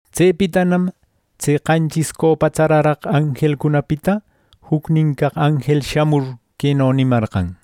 Tsepitanam tse qanchis copa tsaraq anjelcunapita jucnin caq anjel shamur queno nimarqan: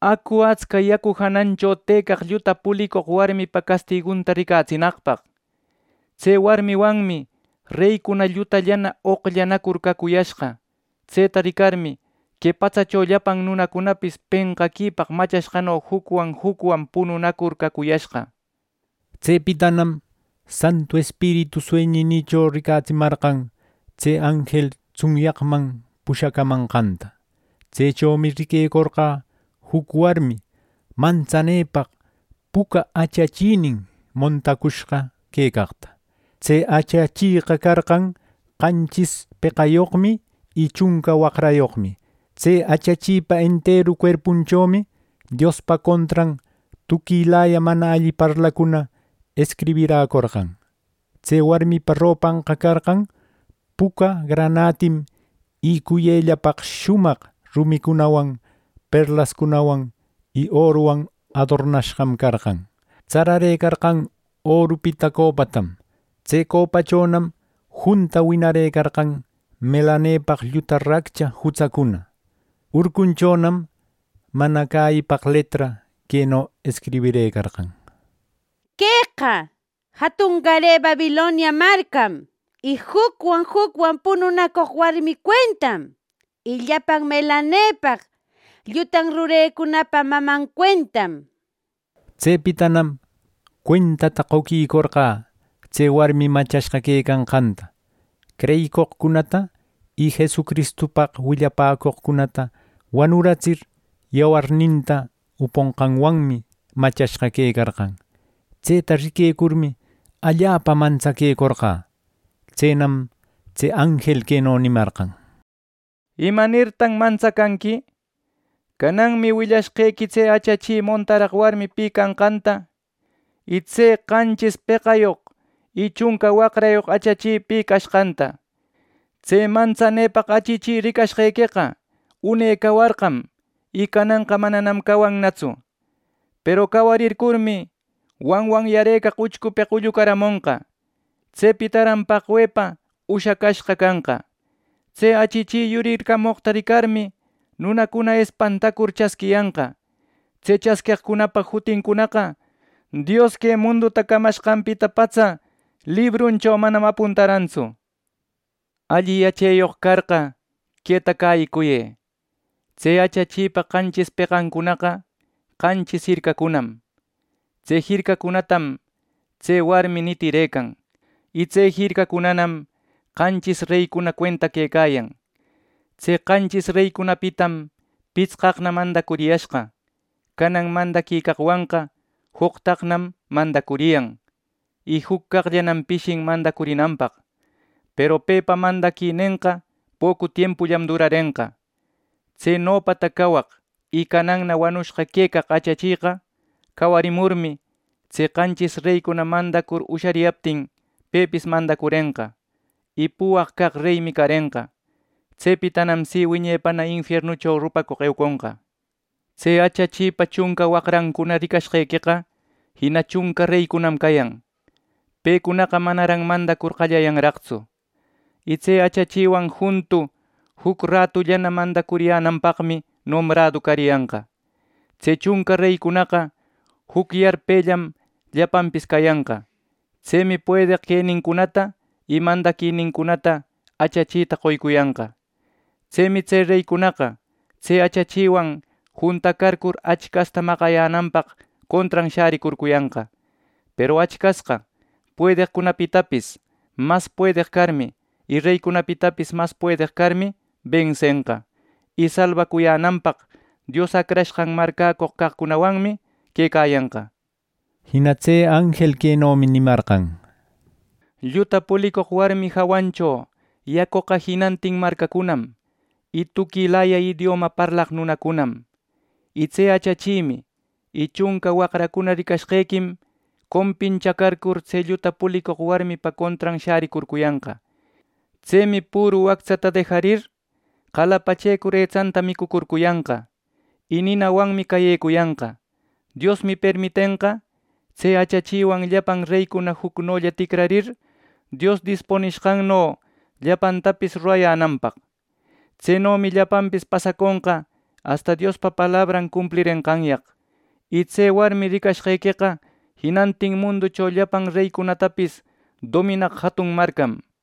“Acu, atsca yacu janancho tëcaq lluta pulicoq warmipa castigunta ricatsinaqpaq” nir. Tse warmiwanmi reycuna llutallana oqllanacur cacuyashqa. Tseta ricarmi, que patsacho llapan nunacunapis penqaquipaq machashqano jucwan jucwan pununacur cacuyashqa. Tsepitanam Santu Espiritu sueñinïcho ricatsimarqan tse anjel tsunyaqman pushacamanqanta. Tsechomi riquecorqä juc warmi mantsanepaq puca achachinin montacushqa quecaqta. Tse achacheqa carqan qanchis peqayoqmi y chunca waqrayoqmi. Tse achachipa enteru cuerpunchomi Diospa contran tuquilaya mana alli parlacuna escribiräcorqan. Tse warmipa ropanqa carqan puca granatim y cuyellapaq shumaq rumicunawan, perlascunawan y oruwan adornashqam carqan. Tsararëcarqan orupita copatam. Tse copachonam junta winarëcarqan melanepaq lluta raccha jutsancuna. Urcunchonam mana cäyipaq letra queno escribirëcarqan: “Queqa jatungare Babilonia marcam, y jucwan jucwan pununacoq warmi cuentam, y llapan melanepaq llutan rurecunapa maman cuentam” nishpa. Tsepitanam cuentata qoquicorqä tse warmi machashqa quecanqanta. Creyicoqcunata y Jesucristupaq willapäcoqcunata wanuratsir yawarninta uponqanwanmi machashqa quecarqan. Tseta riquecurmi, allapa mantsaquecorqä. Tsenam tse anjel queno nimarqan: “¿Imanirtaq mantsacanqui? Cananmi willashqequi tse achachi montaraq warmi pi canqanta, y tse qanchis peqayoq y chunca waqrayoq achachi pi cashqanta. Tse mantsanepaq achachi ricashqequeqa une cawarqam, y cananqa mananam cawannatsu; peru cawarimurmi, wanwanyarëcaq uchcupeq ullucaramonqa. Tsepitaran paqwepa ushacashqa canqa. Tse achachi yuricarcamoqta ricarmi, nunacuna espantacur chasquiyanqa. Tse chasqueqcunapa jutincunaqa Dios que munduta camacashqanpita patsa libruncho manam apuntarantsu. Alli yacheyoq carqa, queta cäyicuyë: Tse achachipa qanchis peqancunaqa qanchis jircacunam. Tse jircacunatam tse warmi nitirëcan, y tse jircacunanam qanchis reycuna cuenta quecayan. Tse qanchis reycunapitam pitsqaqna mandacuriyashqa. Canan mandaquicaqwanqa joqtaqnam mandacuriyan, y juc caqllanam pishin mandacurinanpaq; peru pepa mandaquinenqa pocu tiempullam durarenqa. Tse nopata cawaq y cananna wanushqa quecaq achacheqa cawarimurmi, tse qanchis reycuna mandacur ushariyaptin pepis mandacurenqa; y puwaq caq reymi carenqa. Tsepitam si wiñepana infiernucho rupacoq euconqa. Tse achachipa chunca waqrancuna ricashqequeqa jina chunca reycunam cayan. Pecunaqa manaran mandacur qallayanraqtsu, y tse achachiwan juntu juc ratullana mandacuriyänanpaqmi nombrado cariyanqa. Tse chunca reycunaqa juc yarpellam llapanpis cayanqa. Tsemi puedeq quenincunata y mandaquinincunata achachita qoycuyanqa. Tsemi tse reycunaqa tse achachiwan juntacarcur Achcasta maqayänanpaq contran shäricurcuyanqa; peru Achcasqa puedeqcunapitapis mas puedeq carmi y reycunapitapis mas puedeq carmi bensenqa, y salbacuyänanpaq Dios Acrashqan marcäcoq caqcunawanmi quecayanqa.” Jina tse anjel quenomi nimarqan: “Lluta pulicoq warmi jawancho yacoqa jinantin marcacunam y tuquilaya idioma parlaq nunacunam. Y tse achachimi y chunca waqracuna ricashqequim compinchacarcur, tse lluta pulicoq warmipa contran shäricurcuyanqa. Tsemi püru wactsata dejarir, qalapachecur etsanta micucurcuyanqa, y ninawanmi cayecuyanqa. Diosmi permitenqa tse achachiwan llapan reycuna jucnolla ticrarir, Dios dispunishqanno llapantapis rurayänanpaq. Tsenomi llapanpis pasaconqa asta Diospa palabran cumplirenqanyaq. Y tse warmi ricashqequeqa jinantin munducho llapan reycunatapis dominaq jatun marcam” nir.